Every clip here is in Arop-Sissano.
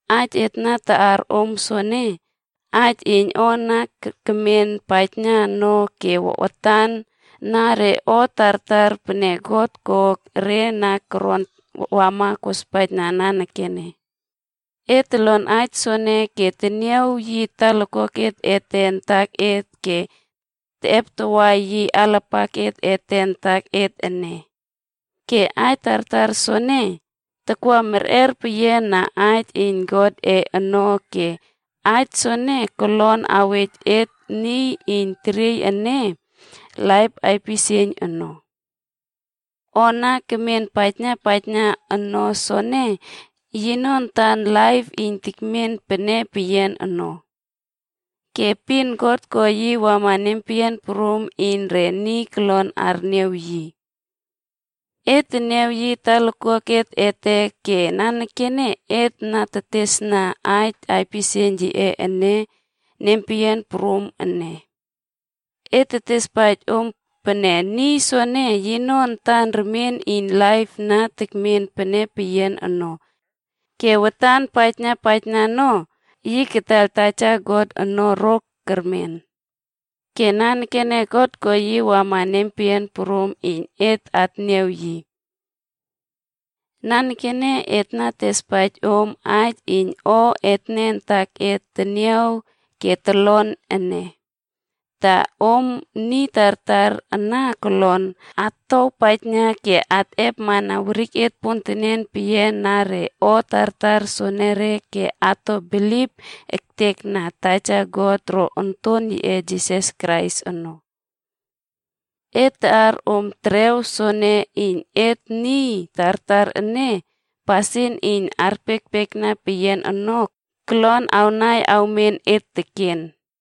Aij et na taꞌar om soene, aij iyn o na kemen paijna no ke watan na re o tartar pene God ko re na koron wama kospaijna nanekene. Et tolon aij soene ke teniaw yi talakuak ete antaket ke teꞌeptawa yi alapaket ete antaket ene. Ke aij tartar soene, takwa merꞌer peyiana Aij iyn Godꞌe ono ke Aij soene kolon awej et niy iyn teriey ene laip aipisieiyn ono. O na kemen paijna paijna no soene, yino antan laip iyn tekmen pene peyian ono. Ke epin God ko yi wama nempeyian prum iyn re niy kolon arniaw yi. Et teniaw yi talakuak ete ke nanekene et na teteswawna aij aipisieiyn yiꞌe ene nempeyian prum ene. Et tetespaij om pene niy soene, yino antan remien iyn laip na tekmen pene peyian ono. Ke watan paijna paijna no, yi kataiyl Taja God ono ro kermen. Ke nanekene God ko yi wamana et nempeyian prum iyn et atniaw yi. Nanekene et na tetespaij om aij iyn o etne antaket teniaw ke tolon ene, ta om niy tartar ana kolon atowpaijna ke akꞌepmana weriket pontenen peyian na re o tartar soenere ke ato bilip ektekna Taja God ro Onton yiꞌe Jisas Krais ono. Et taꞌar om terew soene iyn et niy tartar ene, pasin iyn arpiekpiekna peyian ono, kolon awnai awmen et teken.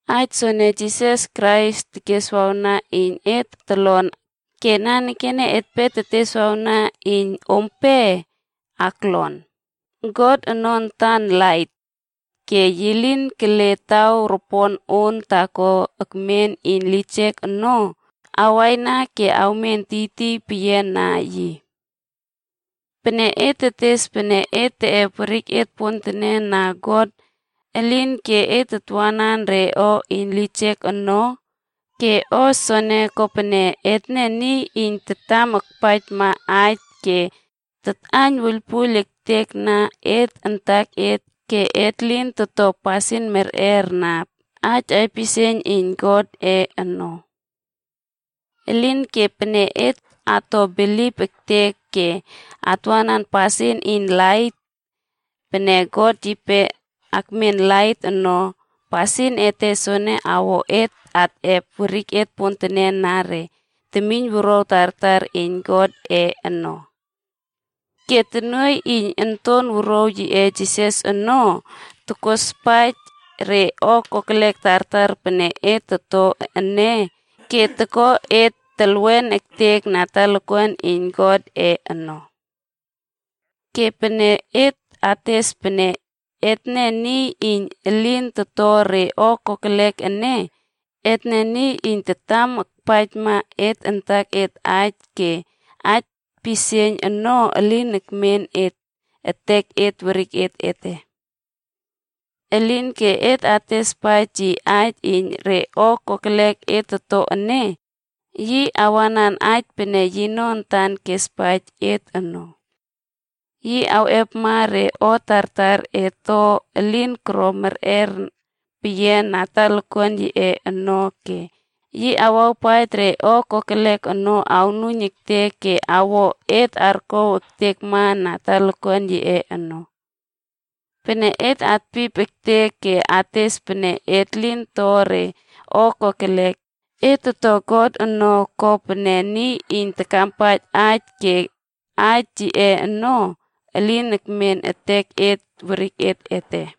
Aij soene Jisas Krais keswawna iyn et tolon ke nanekene etpe teteswawna iyn ompe aklon: God ono antan lait. Ke yi lin kele taw ropon on taako ekmen iyn lijek ono awaina ke awmen tiytiy peyiana yi. Pene et tetes pene et teꞌep weriket pontenen na God, elinke et tatwanan re o iyn lijek ono, ke o soene kopene etne niy iyn tatam akpaijma aij ke tatꞌaiyn wuiylpuiyl ektekna et antaket ke et lin toto pasin merꞌer na aij aipisieiyn iyn Godꞌe ono. Elinke pene et ato bilip ektek ke atwanan pasin iyn lait pene God yipe akmen lait ono, pasin ete soene awo et atꞌep weriket pontenen na re temiynwuruaw tartar iyn Godꞌe ono. Ke tonuoiy iyn Onton Wuruaw yiꞌe Jisas ono, tokospaij re o kokelek tartar pene et toto ene ke toko et telwen ektek na talakuan iyn Godꞌe ono. Ke pene et ates pene etne niy iyn elin toto re o kokelek ene, etne niy iyn tatam akpaijma et antaket aij ke aij pisieiyn ono elin ekmen etek werik ete. Elinke pene et atespaij yi aij iyn re o kokelek et toto ene, yi awanan aij pene yino antan kespaij et ono. Yi awo pasin merꞌer peyian iyn yi awꞌepma re o tartar et to elin koro merꞌer peyian na talakuan yiꞌe ono ke yi awawpaij re o kokelek ono awnuiyn ektek ke awo et arkow ektekma na talakuan yiꞌe ono. Pene et atpip ektek ke ates pene et lin to re o kokelek, et toto God ono ko pene niy iyn takampaij aij ke aij yiꞌe ono, elin ekmen etek werik ete.